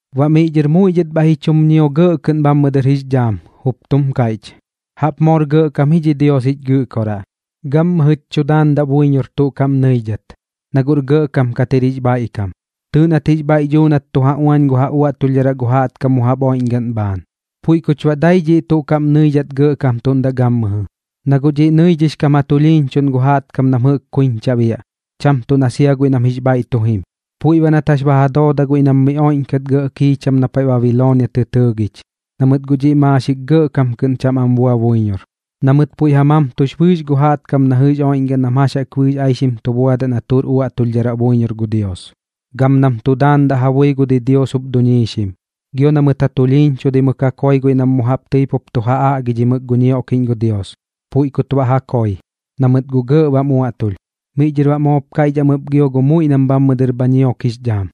Baꞌ miꞌ dhɨr muiꞌ dhɨt bhaiꞌ ji chum ñio gɇꞌ kɨꞌn bhammɨ dɨr jix dhaam, jup tum kaiꞌch: ¡Jaꞌp moor gɇꞌkam ji dhi Dios jich Gɨꞌkoraꞌ! Gammɨjɨch tu daandaꞌ buiñor tuꞌ kaꞌm nɨiꞌdhat, na guꞌr gɇꞌkam kat jir jix bhaiꞌkam. Tɨɨꞌ nat jix bhaiꞌ duu nat tu ja uañ gu ja uaꞌtulhdharaꞌ gu jaꞌtkam mu jaꞌp oiꞌñgaꞌn bhaan, puiꞌ kuch baꞌ dai dhiꞌ tuꞌ kaꞌm nɨidhat gɇꞌkamtuꞌndaꞌ gammɨjɨ. Na guꞌ dhiꞌ nɨidhix kam ja tulhiiñchuꞌn gu jaꞌtkam nam jɨꞌk kuiñcha biaꞌ, cham tuꞌ na sia guiꞌ nam jix bhaiꞌ tu jim. Puiꞌ baꞌ nat jax ba ja dooda guiꞌ nam miꞌ oiꞌñkat gɇꞌ kiicham na paiꞌ Babiloonia tɨ tɨɨgich, na mɨt guꞌ dhiꞌ maaxik gɇꞌkam kɨꞌn cham am bua buiñor, na mɨt puiꞌ ja mamtux bɨɨx gu jaꞌtkam na jɨꞌk oiꞌñgaꞌn nam jax jaꞌk bɨɨx aixim tu buadaꞌ na tuꞌr uaꞌtulhdharaꞌ buiñor gu Dios, gam nam tu daandaꞌ ja bui gu didios jup duñiixim, gio na mɨt ja tulhiiñchudaimɨk ja koi guiꞌ nam mu jaꞌp tɨi pup tu ja aꞌgidhimɨk gu ñioꞌkiꞌñ gu Dios. Puiꞌ kut baꞌ ja koi, na mɨt guꞌ gɇꞌ bam uaꞌtulh. Miꞌ dhɨr baꞌ moop kaiꞌch am ɨp gio gu muiꞌ nam bhammɨ dɨr bha ñiok jix dhaam: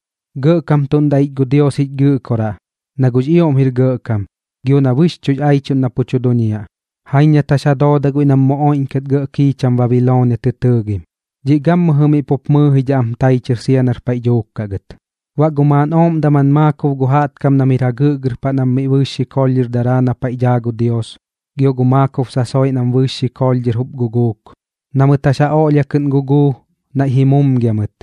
―Gɇꞌkamtuꞌndaꞌ ich gu Dios jich Gɨꞌkoraꞌ, na guꞌx ioꞌm jir gɇꞌkam, gio na bɨxchuꞌx aichuꞌn na pu tu duñiaꞌ. Jaiñ nat jax ja dooda guiꞌ nam mu oiꞌñkat gɇꞌ kiicham Babiloonia tɨ tɨɨgim. Dhiꞌ gammɨjɨ miꞌ pup mɨɨjidhaꞌ am tai chɨr sia nar paiꞌ dhuuk kaꞌ gɨt. Baꞌ gu maaꞌn ooꞌm daman maakob gu jaꞌtkam nam jir jagɨꞌgɨr paꞌ nam bɨɨx xikoolh dhɨr daraa miꞌ na paiꞌ daa gu Dios, gio baꞌ gu maakob sasoiꞌ nam bɨɨx xikoolh dhɨr jup guguuk, na mɨt jax ja oꞌlhia kɨꞌn guguu, naiꞌ ji mumgia mɨt,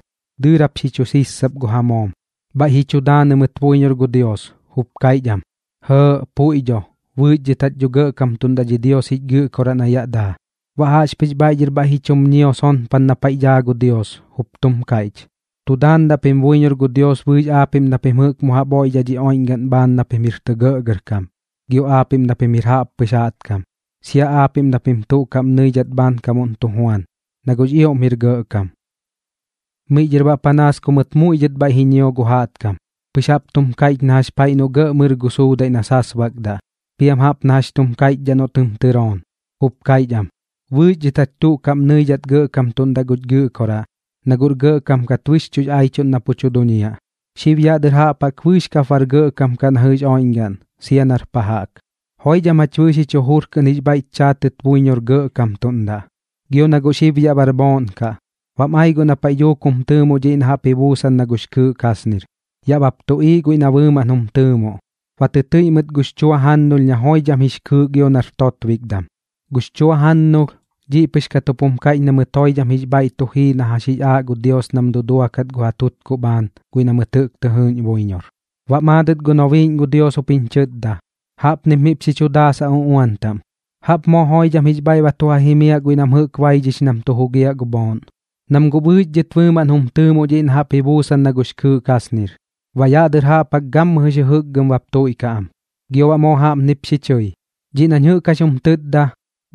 dɨɨrap xi chu sissap gu ja moom, bhaiꞌ ji chu daanɨ mɨt buiñor gu Dios, jup kaiꞌch am: ―Jɇɇꞌ, puiꞌ dho. Bɨɨx dhɨt jach dho gɇꞌkamtuꞌndaꞌ dhi Dios jich Gɨꞌkoraꞌ na yaꞌ daa. Baꞌ jaꞌxpɨx bhaiꞌ dhɨr bhaiꞌp ji chum ñio sonpan na paiꞌ daa gu Dios, jup tum kaiꞌch: Tu daandaꞌ pim buiñor gu Dios bɨɨx aapiꞌm na pim jɨꞌk mu jaꞌp oiꞌdhaꞌ dhi oiꞌñgaꞌn bhaan na pim jir tɇ gɇꞌgɇrkam, gio aapiꞌm na pim jir jaꞌppɨx jaꞌtkam, sia aapiꞌm na pim tuꞌ kaꞌm nɨidhat bhaankamuꞌn tu juan, na guꞌx ioꞌm jir gɇꞌkam. Miꞌ dhɨr baꞌ panaas ku mɨt muiꞌ dhɨt bhaiꞌ ji ñio gu jaꞌtkam, pɨx jap tum kaiꞌch na jax paiꞌ noꞌ gɇꞌ mɨr gu suudaiꞌ na sasbakdaꞌ, piam jaꞌp na jax chum kaiꞌchdhaꞌ noꞌ tɨm tɨroon, jup kaiꞌch am: Bɨɨx dhɨt jach tuꞌ kaꞌm nɨidhat gɇꞌkamtuꞌndaꞌ guch Gɨꞌkoraꞌ, na guꞌr gɇꞌkam kat bɨxchuꞌx aichuꞌn na pu tu duñiaꞌ. Xib yaꞌ dɨr jaꞌp jaꞌk bɨɨx kap sia bar gɇꞌkam kaꞌ na jɨꞌx oiꞌñgaꞌn gam sia nar pa jaꞌk. Joidham jach bɨɨx jich jujur kɨꞌn jix bhaiꞌch chaatɨt buiñor gɇꞌkamtuꞌndaꞌ. Gio na guꞌ xib yaꞌr bhooꞌn kaꞌ, bam ai guꞌ na paiꞌ dhuuk jum tɨɨmoꞌ dhiꞌ na jaꞌp ji buusan na gux kɨɨꞌ kasnir. Yaꞌ bap tuꞌiiꞌ guiꞌ na bɨɨmaꞌn jum tɨɨmoꞌ, ba tɨtɨiꞌ mɨt gux chua jannulh na joidham jir jix kɨɨꞌ gio nar totbikdam. Gux chua jannulh, dhiꞌ pɨx kat jup jum kaiꞌch na mɨt joidham jix bhaiꞌ tu jii na jax jix aaꞌ gu Dios nam duduakat gu ja tutkuꞌ bhaan guiꞌ nam jɨꞌk tɨ jɨɨꞌñ buiñor. Baꞌ maadɨt gu nobiiꞌñ gu Dios jup jiñ chɨtda: ―Jaꞌpnip miꞌp xi chu daasaꞌ uꞌuan taꞌm: “¡Jaꞌp moo joidham jix bhaiꞌ tu ja jimiaꞌ guiꞌ nam jɨꞌk baidhix nam tu jugiaꞌ gu bhooꞌn, nam guꞌ bɨɨx dhɨt bɨɨmaꞌn jum tɨɨmoꞌ dhiꞌ na jaꞌp ji buusan na gux kɨɨꞌ kasnir! Baꞌ yaꞌ dɨr jaꞌp jaꞌk gammɨjɨx jɨjɨkgɨm bap tuiꞌkaꞌ am.” Gio baꞌ moo jaꞌpnip xi chɨi: ―Dhiꞌ nañ jɨꞌk jax jum tɨtda,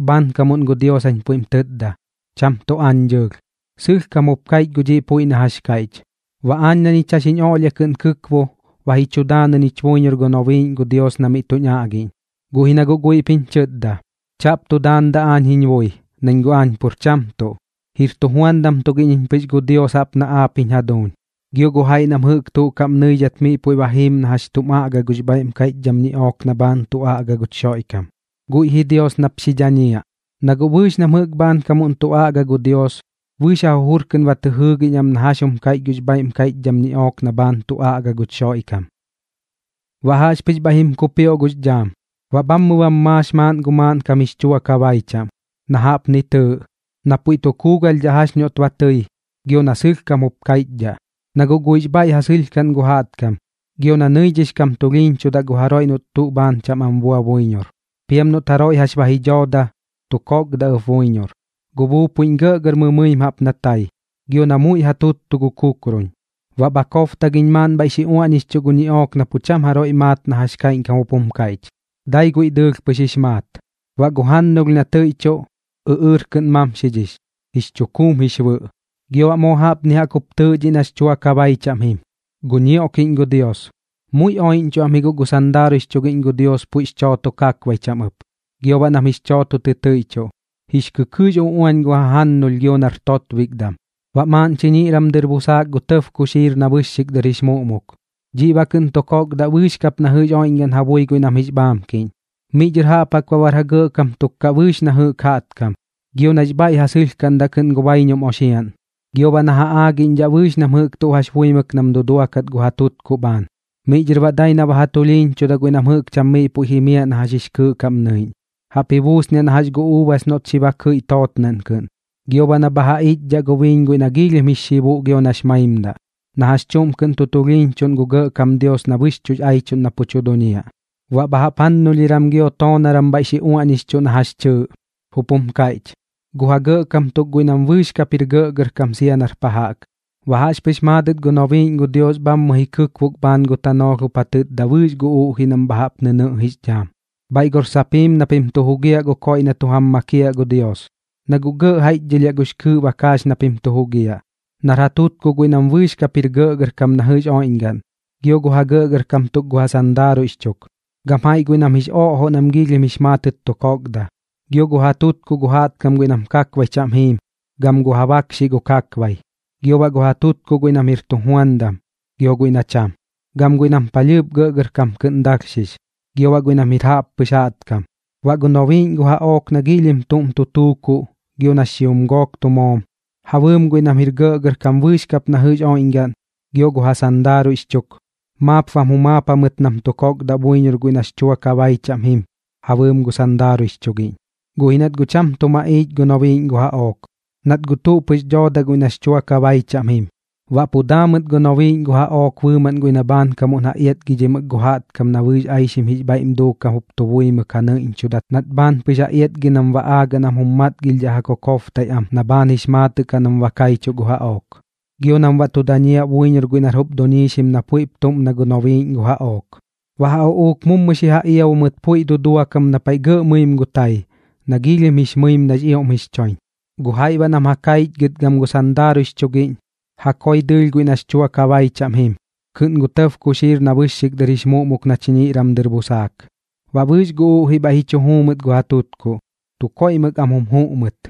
bhaankamuꞌn gu Dios jañ puiꞌm tɨtda, cham tuꞌ aañ dɨɨlh. Sɨlhkam jup kaiꞌch gu dhiꞌ puiꞌ na jax kaiꞌch. Baꞌ aañ na ñich jax jiñ oꞌlhia kɨꞌn kɨkbo, ba ji chu daanɨ ñich buiñor gu nobiiꞌñ gu Dios na miꞌ tuñ aꞌgiꞌñ, guꞌ ji na guꞌ guiꞌp jiñ chɨtda: ―Chaꞌp tu daandaꞌ aañ jiñ bui, nañ guꞌ aañ pur cham tuꞌ. Jir tujuandam tugiꞌñ iñ pɨx gu Dios jaꞌp na jax aap jiñ jaduuñ gio gu jaiꞌ nam jɨꞌk tuꞌ kaꞌm nɨidhat miꞌ puiꞌ ba jiim na jax chum aꞌga gux bhaiꞌm kaiꞌchdham ñiꞌook na bhaan tu aꞌga guch Xoiꞌkam. Guiꞌ ji Dios nap xi dhañiaꞌ. Na guꞌ bɨɨx nam jɨꞌk bhaankamuꞌn tu aꞌga gu Dios, bɨɨx ja jujur kɨꞌn ba tɨ jɨɨgiꞌñ am na jax jum kaiꞌch gux bhaiꞌm kaiꞌchdham ñiꞌook na bhaan tu aꞌga guch Xoiꞌkam. Baꞌ jaꞌxpɨx bhaiꞌ jim kupioꞌ gux dhaam, baꞌ bhammɨ bam maax maaꞌn gu maaꞌnkam jix chua kabai chaꞌm, na jaꞌpni tɨɨꞌ: Na puiꞌ tu kuugalhdhidhaꞌ jax noꞌt ba tɨi, gio na sɨlhkam jup kaiꞌchdhaꞌ. Na guꞌ guiꞌx bhaiꞌ ja sɨlhkaꞌn gu jaꞌtkam, gio na nɨidhix kam tulhiiñchudaꞌ gu jaroiꞌ noꞌt tuꞌ bhaan cham am bua buiñor. Piam noꞌt jaroiꞌ jax ba ji dhooda, tu kokdaꞌ ɨp buiñor. Gu buupuiꞌñ gɇꞌgɇr mɨmɨim jaꞌp na tai, gio na muiꞌ ja tuttutuꞌ gu kukrun. Baꞌ bha kobtagiñ maaꞌn bhaiꞌ xi uaꞌñixchuꞌ gu ñiꞌook na pu cham jaroiꞌ maat na jax kaiꞌñkam jup jum kaiꞌch, dai guiꞌ dɨɨlh pɨx jix maat. Baꞌ gu jannulh na tɨiꞌchuꞌ, ɨꞌɨɨr kɨꞌn mamxidhix, jix chukuum jix bɨꞌ. Gio baꞌ moo jaꞌpni jaꞌk jup tɨɨꞌ dhiꞌ jɨꞌ nax chua kabai chaꞌm jim: Gu ñioꞌkiꞌñ gu Dios. Muiꞌ oiꞌñchuꞌ am ji guꞌ gu sandaaruiꞌx chugiꞌñ gu Dios puiꞌx chooto kakbai chaꞌm ɨp, gio baꞌ nam jix chooto tɨtɨiꞌchuꞌ, jix kɨkɨɨꞌx uꞌuañ gu ja jajannulh gio nar totbikdam. Baꞌ maaꞌn chiñiꞌram dɨr busaak gu tɇb kuxiir na bɨxxik dɨr jix muꞌmuk. Dhiꞌ baꞌ kɨꞌn tu kokdaꞌ bɨɨx kap na jɨꞌx oiꞌñgaꞌn ja bui guiꞌ nam jix bhaamkiꞌñ. Miꞌ dhɨr jaꞌp jaꞌk baꞌ bar ja gɇꞌkam tuk kaꞌ bɨɨx na jɨꞌk jaꞌtkam, gio nax bhaiꞌ ja sɨlhkaꞌndaꞌ kɨꞌn gu baiñum oxiaꞌn, gio baꞌ na ja aagiꞌñdhaꞌ bɨɨx nam jɨꞌk tuꞌ jax buimɨk nam duduakat gu ja tutkuꞌ bhaan. Miꞌ dhɨr baꞌ dai na ba ja tulhiiñchudaꞌ guiꞌ nam jɨꞌk cham miꞌ puiꞌ jimiaꞌ na jax jix kɨɨꞌ kaꞌm nɨiꞌñ, jaꞌp ji buusniaꞌ na jax gu uubas noꞌt xi ba kɨiꞌ tootnaꞌn kɨꞌn, gio baꞌ na bha ja iꞌchdhaꞌ gu biiñ guiꞌ na giilhim jix xibuꞌ gio nax maimdaꞌ, na jax chuꞌm kɨꞌn tu tulhiiñchuꞌn gu Gɇꞌkam Dios na bɨxchuꞌx aichuꞌn na pu tu duñiaꞌ. Baꞌ bha jaꞌp jannulhiram gio toonaram bhaiꞌ xi uaꞌñixchuꞌ na jax chɨɨꞌ, jup jum kaiꞌch: Gu ja gɇꞌkam tuk guiꞌ nam bɨɨx kap jir gɇꞌgɇrkam sia nar pa jaꞌk. Baꞌ jaꞌxpɨx maadɨt gu nobiiꞌñ gu Dios bhammɨ ji kɨkbok bhaan gu tanoolh jup ja tɨtda bɨɨx gu uꞌjiꞌ nam bha jaꞌp nɨnɨꞌx dhaam: ―Bhaiꞌ gor sap jiim na pim tu jugiaꞌ gu koiꞌ na tu jam makiaꞌ gu Dios. Na guꞌ gɇꞌ jaiꞌchdhɨlhiaꞌ gux kɨɨꞌ bakaax na pim tu jugiaꞌ, nar ja tutkuꞌ guiꞌ nam bɨɨx kap jir gɇꞌgɇrkam na jɨꞌx oiꞌñgaꞌn, gio gu ja gɇꞌgɇrkam tuk gu ja sandaaruiꞌx chuk, gam jaiꞌ guiꞌ nam jix oꞌjoꞌ nam giilhim jix maatɨt tu kokda, gio gu ja tutkuꞌ gu jaꞌtkam guiꞌ nam kakbai chaꞌm jiim gam gu ja bakxiꞌ gu ja kakbaiꞌ, gio baꞌ gu ja tutkuꞌ guiꞌ nam jir tujuandam gio baꞌ guiꞌ nam cham, gam guiꞌ nam palhɨɨp gɇꞌgɇrkam kɨꞌn dalhxix, gio baꞌ guiꞌ nam jir jaꞌppɨx jaꞌtkam. Baꞌ gu nobiiꞌñ gu jaꞌook na giilhim tuꞌm tu tuukuꞌ gio nax xijum gook tu moom, ja bɨɨm guiꞌ nam jir gɇꞌgɇrkam bɨɨx kap na jɨꞌx oiꞌñgaꞌn, gio gu ja sandaaruiꞌx chuk, maap bam jumaap jamɨt nam ba tu kokdaꞌ buiñor guiꞌ nax chua kabai chaꞌm jim ja bɨɨm gu sandaaruiꞌx chugiꞌñ. Guꞌ ji nat guꞌ cham tuꞌ maꞌiich gu nobiiꞌñ gu jaꞌook, nat guꞌ tuꞌ pɨx dooda guiꞌ nax chua kabai chaꞌm jim. Baꞌ pu daa mɨt gu nobiiꞌñ gu jaꞌook bɨɨmaꞌn guiꞌ na bhaankamuꞌn ja iatgidhimɨk gu jaꞌtkam na bɨɨx aixim jix bhaiꞌm duukam jup tu buimɨk ja nɨiꞌñchudat nat bhaan pɨx ja iatgi nam baꞌ aagaꞌ nam jum matgilhdhaꞌ ja kokobtaiꞌ am na bhaan jix maatɨꞌ kaꞌ nam ba kaichuꞌ gu jaꞌook, gio nam baꞌ tu dañiaꞌ buiñor guiꞌ nar jup duiñxim na puiꞌp tuꞌm na gu nobiiꞌñ gu jaꞌook. Baꞌ ja uꞌuuk mummu xi ja iabu mɨt puiꞌ dudua kam na paiꞌ gɇꞌ mɨim gu tai, na giilhim jix mɨim nax ioꞌm jix choiñ. Gu jaiꞌ baꞌ nam kaichgɨt gam gu sandaaruiꞌx chugiꞌñ, ja koi dɨɨlh guiꞌ nax chua kabai chaꞌm jim kɨꞌn gu tɇb kuxiir na bɨxxik dɨr jix muꞌmuk na chiñiꞌram dɨr busaak. Baꞌ bɨɨx gu uꞌjiꞌ bhaiꞌ ji chu juu mɨt gu ja tutkuꞌ, tu koiꞌmɨk am jum juꞌ mɨt.